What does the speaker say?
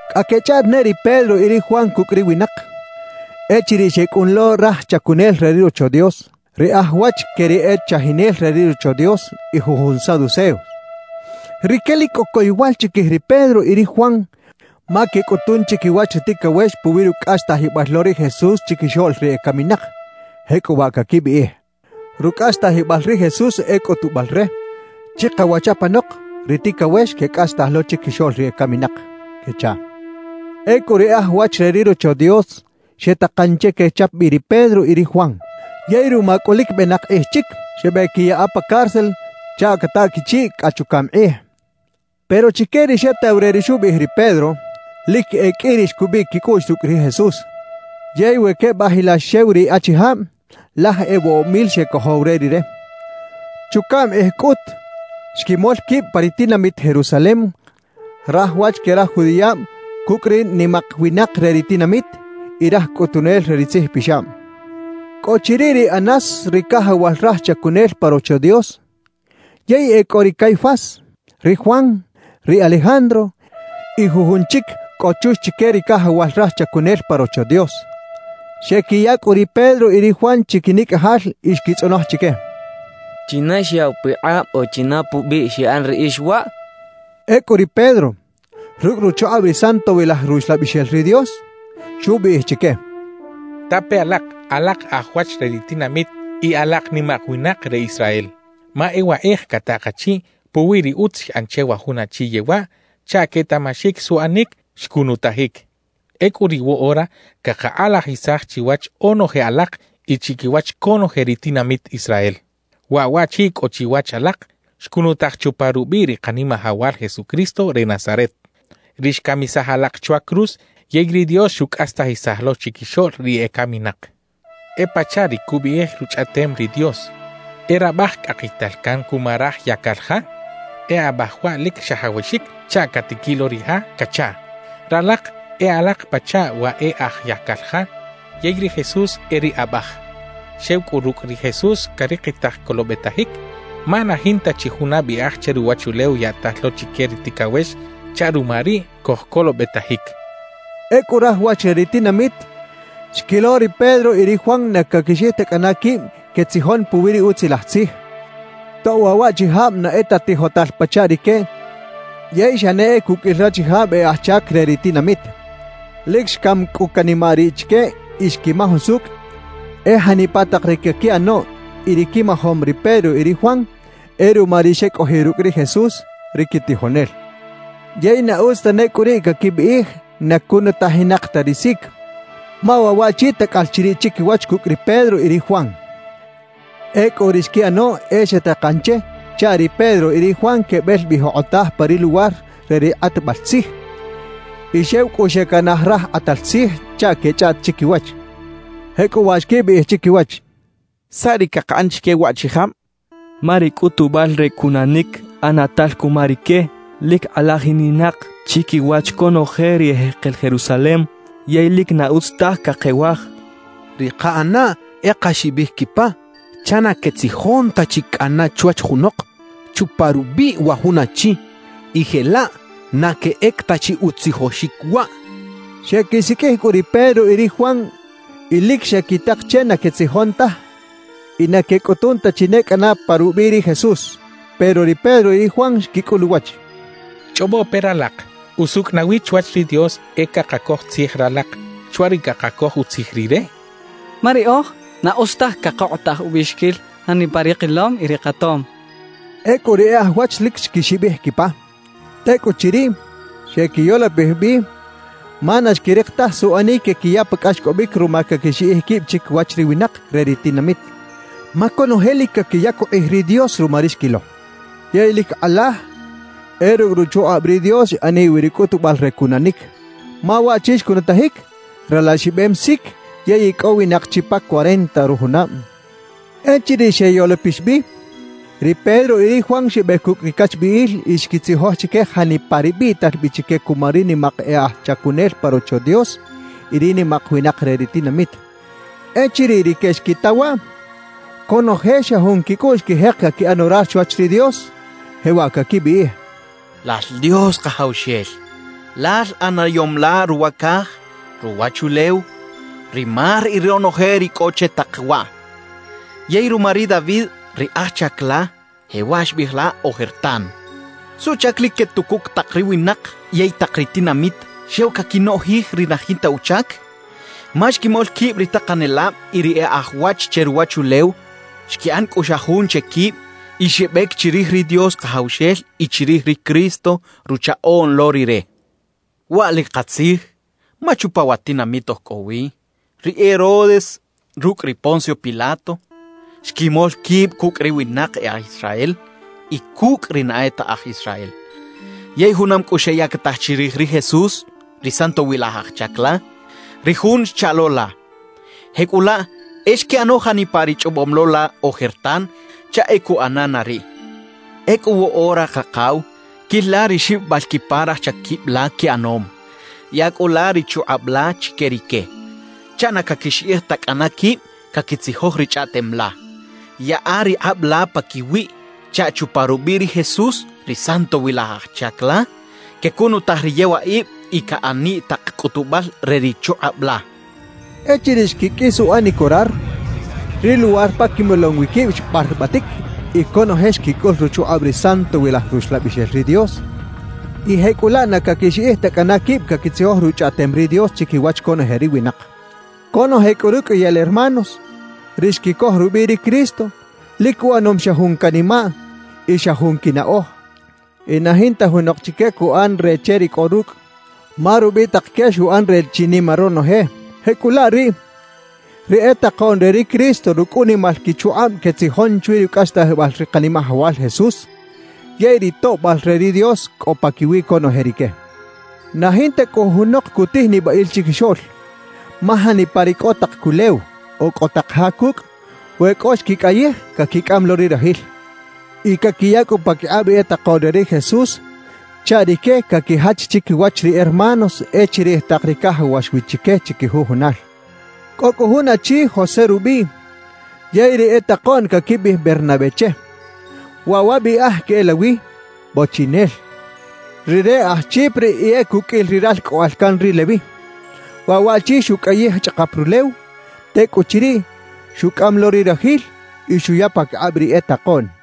Cꞌa quechꞌaꞌt ne ri Pedro y ri Juan cucꞌ ri winak, echiriꞌ xecꞌun lo raj chacunel re ri Rocho Dios, ri aj wach que ri e chajinel re ri Rocho Dios y jujun saduceos. Rique lic cꞌo coyowal chiquij ri Pedro y ri Juan ma quecꞌutun chiquiwach ri ticawex puwi rucꞌastajibal lo ri Jesús chiquixoꞌl ri ecaminak, jecꞌuwaꞌ caquibiꞌij: «Rucꞌastajibal ri Jesús e cꞌutubal re, chikawach apanok ri ticawex quecꞌastaj lo chiquixoꞌl ri ecaminak» quechaꞌ. Ecꞌu ri e aj wach re ri Rocho Dios xetakan che quechap bi ri Pedro y ri Juan. Yey ruma cꞌu lic benak kꞌij chic, xebeꞌquiyaꞌa pa cárcel chaꞌ cataꞌ quichiꞌ cꞌa chucaꞌm kꞌij. Pero chique ri xetaw re ri xubiꞌij ri Pedro, lic e qꞌui ri xcubiꞌ quicꞌuꞌx rucꞌ ri Jesús; yey we quebajilax xew ri achijab, laj e woꞌob mil xecojow re Rire. Chucaꞌm kꞌij cꞌut xquimol quib pa ri tinamit Jerusalem raj wach que raj judiꞌab cucꞌ ri nimak winak re ri tinamit y raj cꞌutunel re ri tzijpixab. Cꞌo chiriꞌ ri Anás ri cajawal raj chacunel pa Rocho Dios; yey e cꞌo ri Caifás, ri Juan, ri Alejandro y jujun chic cꞌo chux chique ri cajawal raj chacunel pa Rocho Dios. Xequiya cꞌu ri Pedro y ri Juan chiquinicꞌajal y xquitzꞌonoj chique: —¿China xyaꞌw pikꞌab o china pubiꞌ xiꞌan riꞌix waꞌ? —xecha chique. Ecꞌu ri Pedro, rucꞌ ruchukꞌab ri Santowilaj Ruxlabixel ri Dios, xubiꞌij chique: —Tape alak, alak aj wach re ri tinamit y alak nimak winak re Israel, ma e wakꞌij cataꞌ kachiꞌ puwi ri utz xꞌan che wa jun achi yewaꞌ chaꞌ quetaꞌmaxic suꞌanic xcunutajic. Ecꞌu riꞌ woꞌora cakakꞌalajisaj chiwach onoje alak y chiquiwach conoje ri tinamit Israel: Waꞌ waꞌchi cꞌo chiwach alak xcunutaj chupa rubiꞌ ri Kanimajawal Jesucristo re Nazaret, ri xcamisaj alak chwa cruz yey ri Dios xucꞌastajisaj lo chiquixoꞌl ri ecaminak. »E pachaꞌ ri cubiꞌij Ruchꞌaꞌtem ri Dios: E rabaj cꞌakital can cuma raj yacal ja, e abaj waꞌ lic xajawaxic chaꞌ catiquiꞌ lo ri ja cachaꞌ. Ralak e alak pachaꞌ wa e aj yacal ja yey ri Jesús e ri Abaj. Xew cꞌu rucꞌ ri Jesús carikitaj colobetajic, ma na jinta chi juna biꞌaj che ruwachulew yaꞌtal lo chique ri ticawex chaꞌ ruma riꞌ cojcolobetajic —xchaꞌ. Ecꞌu raj wach re ri tinamit xquilo ri Pedro y ri Juan na caquixiꞌij ta cꞌana quib quetzijon puwi ri Utzilaj Tzij, tob waꞌ waꞌchijab na e ta tijotal pachaꞌ rique yey xa ne e cuqꞌuil rachijab e aj chac re ri tinamit. Lic xcam cꞌu canimaꞌ riꞌ chique y xquimaj usucꞌ e janipa tak ri caquiꞌano y ri quimajom ri Pedro y ri Juan, e ruma ri xecꞌojiꞌ rucꞌ ri Jesús, ri quitijonel. Yey na utz tane cꞌu riꞌ caquibiꞌij na cunutajinak ta ri sic, ma waꞌ waꞌchi tacꞌal chiriꞌ chiquiwach cucꞌ ri Pedro y ri Juan. Ecꞌu ri xquiꞌano e xetakan che chaꞌ ri Pedro y ri Juan quebel bi jokꞌotaj pa ri luwar re ri kꞌatbal tzij, y xew cꞌu xecanaj raj kꞌatal tzij chaꞌ quechꞌaꞌt chiquiwach. Jecꞌuwaꞌ xquibiꞌij chiquiwach: «¿Saꞌ ri cakaꞌan chique waꞌchijab? Ma ri cꞌutubal re cunanic ꞌanatal cuma rique, lic kꞌalajininak chiquiwach conoje ri ejekel Jerusalem yey lic na utz taj cakewaj. Ri kaꞌanaꞌ e kaxibij quipa chaꞌ na quetzijon ta chi cꞌana chwach junok chupa rubiꞌ wa jun achi, y jelaꞌ na queꞌec ta chi utzijoxic waꞌ» xechaꞌ. Xequisiqꞌuij cꞌu ri Pedro y ri Juan y lic xequitak che na quetzijon taj y na quecꞌutun ta chi ne cꞌana pa rubiꞌ ri Jesús. Pero ri Pedro y ri Juan xquicꞌul uwach: —Chꞌobo pe ralak: ¿Usucꞌ nawi chwach ri Dios e cakacoj tzij ralak chwa ri cakacoj utzij Rire? Ma riꞌoj, na utz taj cakokꞌotaj ubiꞌxiquil janipa ri kilom y ri katom —xechaꞌ. Ecꞌu ri e aj wach lic xquixibij quipa. Tecꞌuchiriꞌ, xequiyolopij bi ma na xquirik taj suꞌanic quequiya pa cꞌaxcꞌobic ruma caquixiꞌij quib chiquiwach ri winak re ri tinamit. Ma conoje lic caquiyac ukꞌij ri Dios ruma ri xquilo. Yey lic kꞌalaj e rucꞌ ruchukꞌab ri Dios xꞌaniꞌ wi ri cꞌutubal re cunanic, ma waꞌchi xcunutajic, ralaxibem sic yey icꞌowinak chi pa cuarenta rujunab. Echiriꞌ xeyolopix bi, ri Pedro y ri Juan xebec cucꞌ ri cachbiꞌil y xquitzijoj chique janipa ri biꞌtal bi chique cuma ri nimak e aj chacunel pa Rocho Dios y ri nimak winak re ri tinamit. Echiriꞌ rique xquita waꞌ, conoje xa jun quicꞌuꞌx xquijek caquiꞌan orar chwach ri Dios, jewaꞌ caquibiꞌij: «¡Lal Dios Kajawxel, Lal ꞌanayom la ruwa caj, ruwachulew, ri mar y ronoje ri cꞌo che tak waꞌ! Yey ruma ri David ri aj chac la, jewaꞌ xbiꞌij la ojertan: ¿Suꞌchac lic quetucuc tak ri winak yey tak ri tinamit xew caquinoꞌjij ri na jinta uchac? Ma xquimol quib ri takanelab y ri e aj wach che ruwachulew, xquiꞌan cꞌu xa jun che quib y xebec chirij ri Dios Kajawxel y chirij ri Cristo, Ruchaꞌoꞌn lo Rire. Waꞌ lic katzij, ma chupa wa tinamit oj cꞌo wi, ri Herodes rucꞌ ri Poncio Pilato xquimol quib cucꞌ ri winak e aj Israel y cucꞌ ri na e ta aj Israel; yey junam cꞌu xeyactaj chirij ri Jesús, ri Santowilaj Aj Chac la, ri Jun xchaꞌ lo la. Jecꞌulaꞌ, e xquiꞌano janipa ri chꞌobom lo la ojertan chaꞌ e cuꞌana na riꞌ. »Ecꞌu woꞌora, Kakaw, quil la ri xibibal quipa raj chaquib la quiꞌanom; yaꞌa cꞌu la ri chukꞌab la chique rique chaꞌ na caquixiꞌij ta cꞌana quib caquitzijoj ri Chꞌaꞌtem la. Yaꞌa ri kꞌab la paquiwiꞌ chaꞌ chupa rubiꞌ ri Jesús, ri Santowilaj Aj Chac la, quecunutaj ri yewaꞌib y caꞌaniꞌ tak cꞌutubal re ri chukꞌab la» xechaꞌ. Echiriꞌ xquiqꞌuis uꞌanic orar, ri luwar pa quimolom wi quib xbarbatic y conoje xquicꞌul ruchukꞌab ri Santowilaj Ruxlabixel ri Dios y jecꞌulaꞌ na caquixiꞌij ta cꞌana quib caquitzijoj Ruchꞌaꞌtem ri Dios chiquiwach conoje ri winak. Conoje cꞌu ruqꞌuiyal hermanos, ri xquicoj rubiꞌ ri Cristo, lic uꞌanom xa jun canimaꞌ y xa jun quinaꞌoj; y na jinta junok chique cuꞌan re che ri cꞌo rucꞌ, ma rubitak que xuꞌan re chinima ronoje. Jecꞌulaꞌ riꞌ, ri e takoꞌn re ri Cristo rucꞌ unimal quichukꞌab quetzijon chwi rucꞌastajibal ri Kanimajawal Jesús, yey ri toꞌbal re ri Dios cꞌo paquiwi conoje rique. Na jinta cꞌu junok cutij nibaꞌil chiquixoꞌl, ma janipa ri cꞌo tak culew o cꞌo tak ja cucꞌ, we cꞌo xquicꞌayij, caquicꞌam lo ri rajil y caquiya cꞌu paquikꞌab ri e takoꞌn re ri Jesús chaꞌ rique caquijach chiquiwach ri hermanos e chirij tak ri cajawax wi chique chiquijujunal. Cꞌo cꞌu jun achi José rubiꞌ, yey ri e takoꞌn caquibiꞌij Bernabé che. (Waꞌ wa biꞌaj queꞌelawi “bochiꞌinel”.) Rire aj Chipre y e cuqꞌuil ri ralcꞌoꞌal can ri Leví. Waꞌ waꞌchi xucꞌayij chꞌakap rulew; tecꞌuchiriꞌ, xucꞌam lo ri rajil y xuya paquikꞌab ri e takoꞌn.